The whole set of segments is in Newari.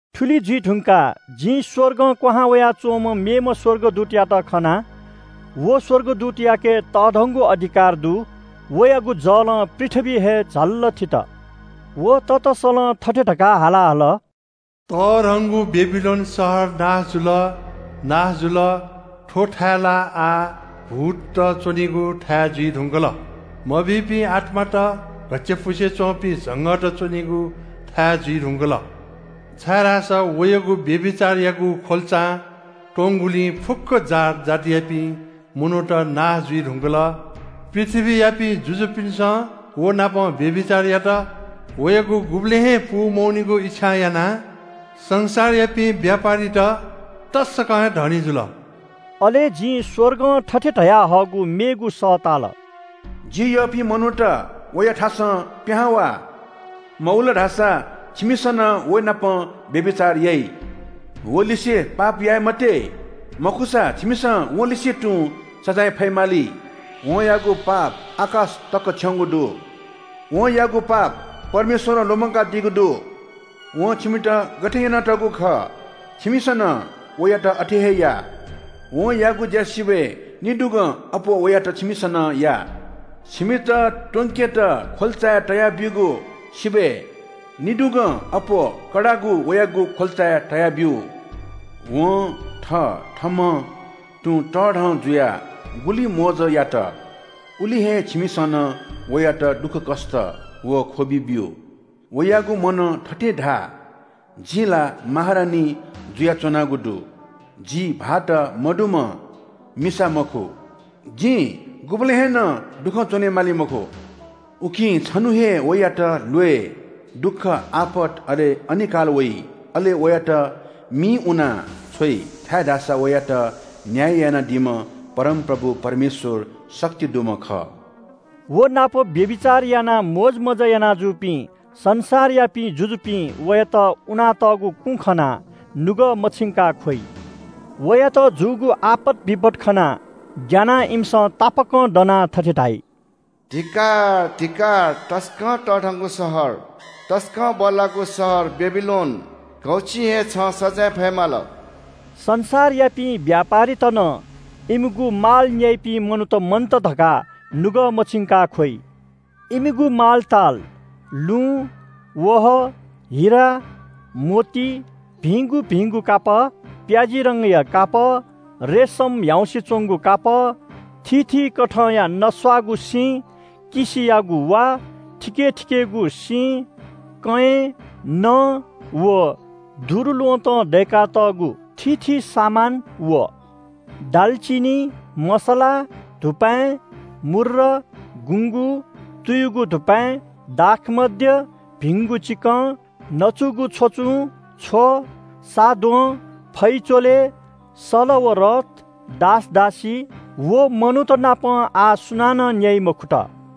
थुलि जुइ धुंकाः जिं स्‍वर्गं क्‍वहां वयाच्‍वंम्‍ह मेम्‍ह स्‍वर्गदूतयात खना। व स्‍वर्गदूतयाके तःधंगु अधिकार दु। वयागु जलं पृथ्‍वी हे झल्‍लल थित। व ततसलं थथे धकाः हाला हल – “तःधंगु बेबिलोन शहर नाश जुल, नाश जुल! थ्‍व थाय् ला आः भूतत च्‍वनीगु थाय् जुइ धुंकल। मभिंपिं आत्‍मात, घच्‍चायापुसे च्‍वंपिं झंगःत च्‍वनीगु थाय् जुइ धुंकल। छाय्‌धाःसा वयागु व्‍यभिचारयागु ख्‍वल्‍चां त्‍वंगुलिं फुक्‍क जात जातियापिं मनूत नाश जुइ धुंकल। पृथ्‍वीयापिं जुजुपिन्‍सं व नाप व्‍यभिचार यात। वयागु गुबलें हे पूमवनीगु इच्‍छां यानाः संसारयापिं व्‍यापारीत तसकं हे धनी जुल।” अले जिं स्‍वर्गं थथे धयाहःगु मेगु सः ताल – “जि यःपिं मनूत, वयाथासं पिहां वा। मवल धाःसा छिमिसं नं व नाप व्‍यभिचार याइ। वलिसे पाप याये मते, मखुसा छिमिसं वलिसे तुं सजाँय फयेमाली। वं याःगु पाप आकाश तक थ्‍यंगु दु। वं याःगु पाप परमेश्‍वरं लुमंकादीगु दु। वं छिमित गथे यानातःगु खः छिमिसं नं वयात अथे हे या। वं याःगु ज्‍या सिबय् निदुगं अप्‍वः वयात छिमिसं नं या। छिमित त्‍वंकेत ख्‍वल्‍चाय् तयाब्‍यूगु सिबय् निदुगं अप्‍वः कडागु वयागु ख्‍वल्‍चाय् तयाब्‍यु। वं थथःम्‍हं तुं तःधं जुयाः गुलि मोज यात, उलि हे छिमिसं नं वयात दुःखकष्‍ट व ख्‍वबि ब्‍यु। वयागु मनं थथे धाः ‘जि ला महारानी जुयाच्‍वनागु दु। जि विधवा मिसा मखु। जिं गुबलें हे नं दुखं च्‍वनेमाली मखु।’ उकिं छन्‍हुं हे वयात ल्‍वय्, दुःख, आपत, अले अनिकाल वइ। अले वयात मिइ उनाछ्वइ, छाय्‌धाःसा वयात न्‍याय यानादीम्‍ह परमप्रभु परमेश्‍वर शक्ति दुम्‍ह खः।” व नाप व्‍यभिचार यानाः मोजमज्‍जा याना जूपिं संसारयापिं जुजुपिं वयात उनातःगु कुँ खनाः नुगः मछिंकाः ख्‍वइ। वयात जूगु आपत बिपत खनाः ग्‍यानाः इमिसं तापाकं दनाः थथे धाइ – “धिक्‍कार, धिक्‍कार तसकं तःधंगु शहर! तसकं बल्‍लाःगु शहर बेबिलोन! घौछिं हे छं सजाँय फये माल।” संसारयापिं व्‍यापारीत नं इमिगु माल न्‍याइपिं मनूत मन्‍त धकाः नुगः मछिंकाः ख्‍वइ। इमिगु मालताल – लुँ, वहः, हिरा, मोती, भिंगु भिंगु कापः, प्‍याजी रंगया कापः, रेसम, ह्याउँसे च्‍वंगु कापः, थीथी कथंया नस्‍वाःगु सिँ, किसियागु वा, थिकेथिकेगु सिँ, कँय्, नँ, व दुरूल्‍वहँतं दय्‌कातःगु थीथी सामान, व दालचिनि, मसला, धुपाँय्, मूर्र, गुँगू, तुयुगु धुपाँय्, दाखमद्य, भिंगु चिकं, नचुगु छ्वचुं, छ्व, सा द्वहं, फै-च्‍वलय्, सल व रथ, दास दासी, व मनूतनापं आः सुनानं न्‍याइ मखुत।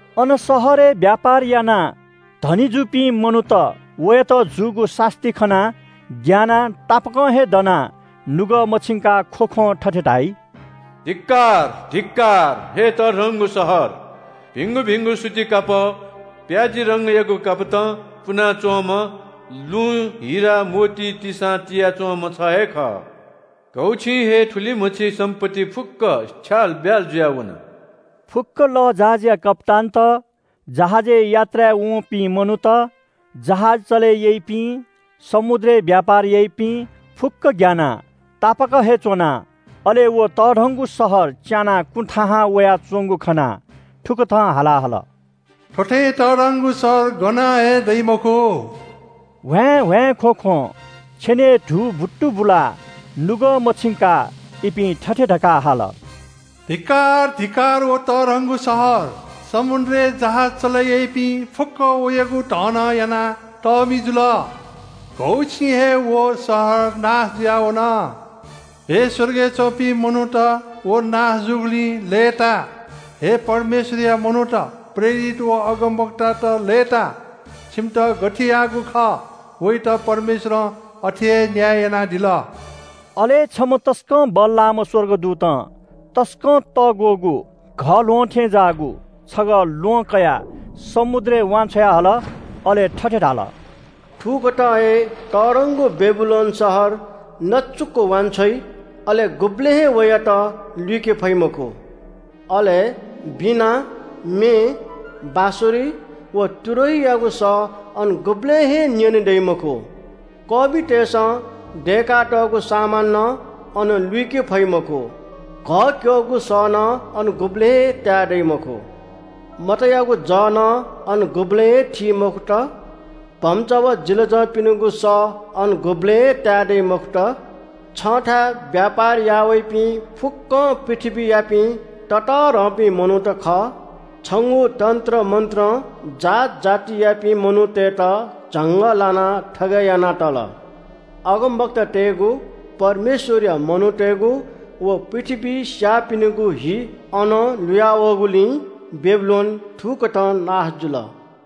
अन शहरय् व्‍यापार यानाः धनी जूपिं मनूत वयात जूगु सास्‍ती खनाः ग्‍यानाः तापाकं हे दनाः नुगः मछिंकाः ख्‍वख्‍वं थथे धाइ – “धिक्‍कार, धिक्‍कार हे तःधंगु शहर! भिंगु भिंगु सूती कापः, प्‍याजी रंगयागु कापतं पुना च्‍वंम्‍ह, लुँ, हिरा, मोती तिसां तिया च्‍वंम्‍ह छ हे खः! घौछिं हे थुलिमछि सम्‍पत्ति फुक्‍क छ्यालब्‍याल जुयाः वन।” फुक्‍क लःजहाजया कप्‍तानत, जहाजय् यात्राय् वंपिं मनूत, जहाज चले याइपिं, समुद्रय् व्‍यापार याइपिं फुक्‍कं ग्‍यानाः तापाक हे च्‍वनाः अले व तःधंगु शहर च्‍यानाः कुँ थाहां वयाच्‍वंगु खनाः थुकथं हाला हल – “थ्‍व थें तःधंगु शहर गनं हे दइ मखु।” ह्वाँय्‌ह्वाँय् ख्‍वख्‍वं छेनय् धू बुतुबुलाः नुगः मछिंकाः इपिं थथे धकाः हाल – “धिक्‍कार, धिक्‍कार, व तःधंगु शहर! समुद्रय् जहाज चले याइपिं फुक्‍कं वयागु धनं यानाः तःमि जुल। घौछिं हे व शहर नाश जुयाः वन। हे स्‍वर्गय् च्‍वंपिं मनूत, व नाश जूगुलिं लय्‌ता! हे परमेश्‍वरया मनूत, प्रेरितत व अगमवक्तात लय्‌ता। छिमित गथे याःगु खः वयात परमेश्‍वरं अथे हे न्‍याय यानादिल।” अले छम्‍ह तसकं बल्‍लाःम्‍ह स्‍वर्गदूतं तसकं तःग्‍वःगु घःल्‍वहं थें ज्‍याःगु छगः ल्‍वहं कयाः समुद्रय् वान्‍छ्वया हल। अले थथे धाल – “थुकथं हे तःधंगु बेबिलोन शहर नचुक वांछ्वइ। अले गुबलें हे वयात लुइके फइ मखु। अले वीणा, म्‍ये, बाँसुरी व तुरहीयागु सः अन गुबलें हे न्‍यनेदइ मखु। कःमितय्‌सं दय्‌कातःगु सामान नं अन लुइके फइ मखु। घःक्‍यःगु सः नं अन गुबलें हे ताये दइ मखु। मतयागु जः नं अन गुबलें थी मखुत। भम्‍चा व जिलाजंपिनिगु सः अन गुबलें ताये दइ मखुत। छन्‍थाय् व्‍यापार याःवइपिं फुक्‍कं पृथ्‍वीयापिं ततःधंपिं मनूत खः। छंगु तन्‍त्रमन्‍त्रं जात जातियापिं मनूतय्‌त झंगः लानाः थगय् याना तल। अगमवक्तातय्‌गु, परमेश्‍वरया मनूतय्‌गु व पृथ्‍वीइ स्‍याःपिनिगु हि अनं लुया वःगुलिं बेबिलोन थुकथं नाश जुल।”